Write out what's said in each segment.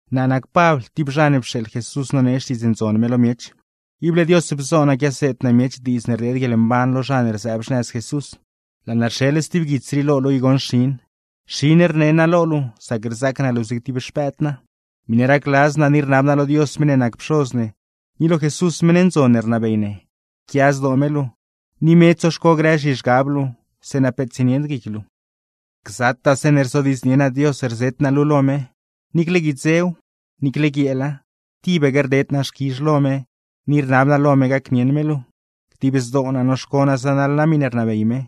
Naa nac Pabl, tib zha ne pxeeḻ Jesús nonee Xtiidz Ndzon me lo miech. Ible Dios bzo naa quiaseed naa miech diidz ne rdeed guieḻmban lo zha ne rzëëb xnëz Jesús. Laa naa rxeḻ stib guits rii lo luu i goṉ xin; xin rne naa lo luu sac rzaac naa luu zig tib xpëëd naa. Miṉe racladz naa ni rnab naa lo Dios meṉ ne nac Pxoz ne, ni lo Jesús meṉ ndzon ne rnabey ne, yquia zdoo me luu, ni me tsoxco grë zhizhgab luu; zeeṉa peet tsienied guic luu. ¡Gzataa zeeṉe rzodiidznie naa Dios rzet naa luu lo me, niicle guidzew, niicle guieela, tibaque rded naa xquizh lo me ni rnab naa lo me gacnieṉ me luu! Dib zdoo naa noxco naa zanaḻ naa miṉe rnabey me,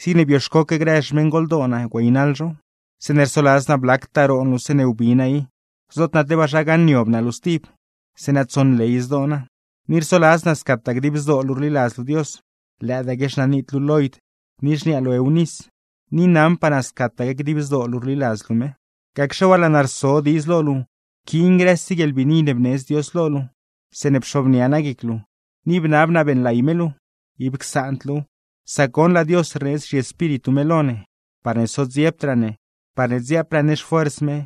zigne bioxcoque grë xmeṉgoldoo naa güeynaḻ zhow. Zeeṉe rsoladz naa blactaa roon luu zeeṉe wbi naa i, zoot naa tebaa zha gaṉniob naa luu stib; zeeṉa tsonley zdoo naa. Ni rsoladz naa scataa dib zdoo luu rliladz luu Dios; lëëdaaque xnanit luu Loid, ni xniaa luu Eunis, ni naṉpaa naa scataque dib zdoo luu rliladz luu me. Gacxe waa, laa naa rso diidz lo luu pquiin grëse guieḻbiini ne bneedz Dios lo luu zeeṉe pxobnia naa guic luu, ni bnab naa beeṉlay me luu. ¡Ib csaand luuw! Sac goṉ, laa Dios rneedz zhiEspíritu me lo ne, parne sodziebdraa ne, parne dziaapraa ne xfuers me,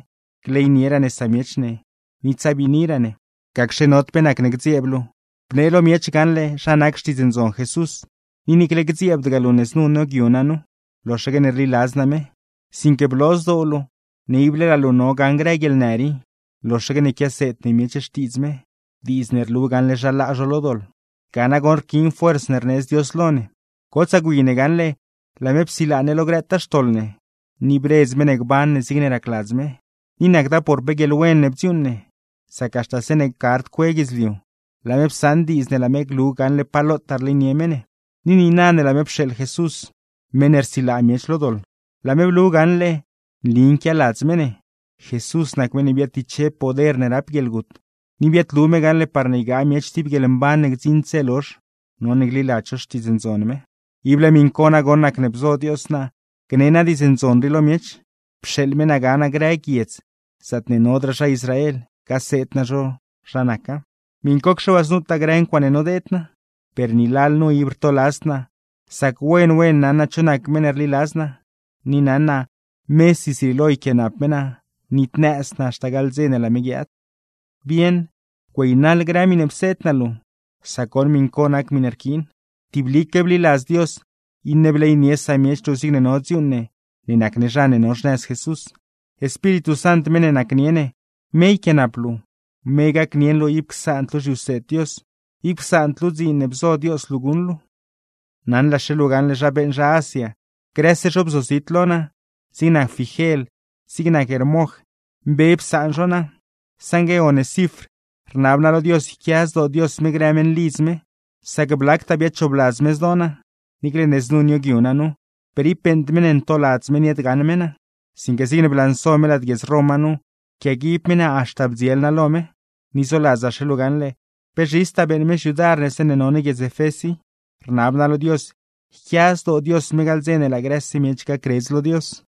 gleynieraa ne samiech ne, ni tsabiiniraa ne. Gacxe nod pe nacne gdzieeb luu, bnee lo miech gaṉle zha nac Xtiidz Ndzon Jesús; ni niicle gdzieebdgaa luu ne znu nioogyu naa nu, loxaque ne rliladz naa me. Sinque bloo zdoo luu ne ib laa luu no gaṉ grë guieḻnë rii, loxaque ne quiaseed ne miech Xtiidz me, diidz ne rlu gaṉle zha laa zho lo doḻ. Ga nagoṉ rquiin fuerz ne rneedz Dios lo ne. Gotsaa gwi ne gaṉle laa me psilaa ne lo grëtaa xtoḻ ne, ni bredz me ne gban ne zigne racladz me. Ni nacda por pe guieḻwen ne bdziuuṉ ne, sac haxta zeeṉe gard cue guidzliu, laa me psaṉ diidz ne laa me glu gaṉle pa lotaa rleynie me ne. Ni niina ne laa me pxeeḻ Jesús (meṉ ne rsilaa miech lo doḻ), laa me blu gaṉle ne nli nquialadz me ne. Jesús nac meṉ ne biaadtiche poder ne rap guieḻgut, ni biaadlu me gaṉle parne ygaa miech tib guieḻmban ne gdziṉd dze lozh, none gliladz zho Xtiidz Ndzon me. Ible miṉ co nagoṉ nacne bzo Dios naa gne naa Diidz Ndzon rii lo miech, pxeeḻ me naa ga naa grë guiedz zaatne nodraa zha Israel, gaseed naa zho zha naca; miṉcocxe waa znutaa grë ncuaaṉe nodeed naa. Per ni lalnu ib rtoladzd naa, sac wen wen naṉ naa cho nac meṉ ne rliladz naa, ni naṉ naa mesi zrieelo yquiaanap me naa nitnëzd naa haxta gaḻ dze ne laa me guiaad. Bieṉ, güeynaḻ grë miṉe pseed naa luu, sac goṉ miṉ co nac miṉe rquiin. Tiblique bliladz Dios, iṉe bleynie samiech luu zigne no dziuuṉ ne ne nac ne zha ne no xnëz Jesús. Espíritu Sant meṉ ne nacnie ne, me yquiaanap luu, me gacnieṉ luu ib csaand luu zhiwseed Dios, ib csaand luu dziin ne bzo Dios luu guṉ luu. Naṉlaxe luu gaṉle zha beeṉ zha Asia, grëse zho bzozit lo naa; zig nac Figel, zig nac Hermoj, mbe psaan zho naa. Saṉgue Onesifr, rnab naa lo Dios yquia zdoo Dios me grë meṉlidz me, sac blactaa biadchoobladz me zdoo naa. Niicle ne znu nioogyu naa nu, per ib beeṉd me ne ntoladz me niaadgaṉ me naa; sinque zigne blanso me lad guiedz Roma nu, pquiaguib me naa haxta bdziel naa lo me. Ni zoladzaxe luu gaṉle, pe zhistaa beeṉ me xyudar ne zeeṉe no ne guiedz Efés i; rnab naa lo Dios yquia zdoo Dios me gaḻ dze ne laa grëse miech gacredz lo Dios.